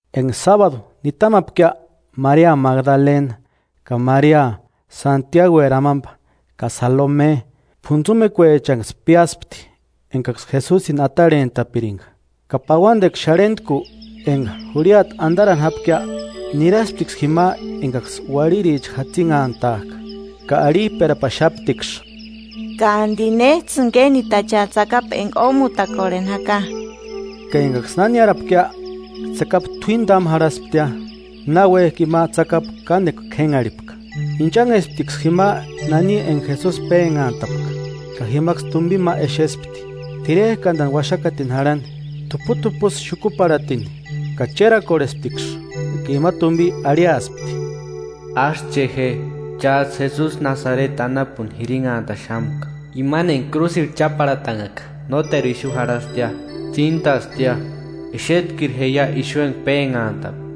Enga sábadu nitamapkia, Maria Magdalena, ka Maria, Santiagueri amamba, ka Salome, p'untsumekuechanksï piáspti engaksï Jesusini atarhentapiringa. Ka pauandekua xarhentku, enga jurhiata andarani jápkia, nirasptiksï jima engaksï uarhiricha jatsinhantajka, ka arhijperapaxaptiksï: –¿Ka andi néjtsïni kénditacheaia tsakapu enga ómutakorheni jaka? Ka engaksï na niárapkia, tsakapu t'uíni támu jarhasptia, náuejki ima tsakapu kánekua k'énharhipka. Inchanhesptiksï jima nani enga Jesusi pénhantapka, ka jimaksï tumbini ma exespti, t'irerkandani uaxakatini jarhani, t'uput'upusï xukuparhatini, ka chérakorhesptiksï. Ka ima tumbi arhiaspti: –Ásï che je. Chájtsï Jesusi Nasareti anapuni jirinhantaxamka, imani enga krúsirhu cháparhatanhaka. Nóteru ixu jarhastia, tsíntastia. Exetkiru jeia axu enga pénhantapka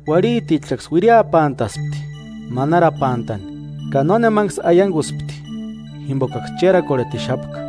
Uarhitichaksï uiriapantaspti, manarapantani, ka nónemaniksï aianguspti, jimbokaksï chérakorhetixapka.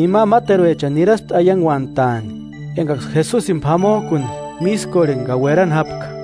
Ima máteruechani niraspti aianguantaani engaksï Jesusini p'amojkuni mískorheni ka uerani jápka.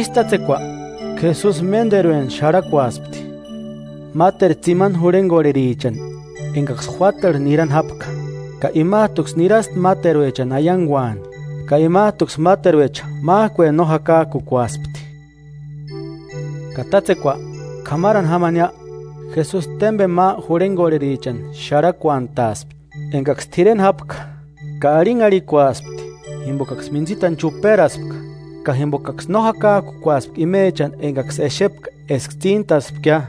Ísï tátsekua, Jesusi ménderueni xarhakuaspti máteru tsimani jurhengorherichani engaksï juátarhu nirani jápka. Ka imajtuksï niraspti máteruechani aianguani; ka imajtuksï máteruecha májkueni no jakajkukuaspti. Ka tátsekua, k'ámarani jámania, Jesusi témbeni ma jurhengorherichani xarhakuantaaspti, engaksï t'ireni jápka. Ka arhinharhikuaspti jimbokaksï mintsitani chuperaspka ka jimbokaksï no jakajkukuaspka imechani engaksï exepka eska tsíntaspkia.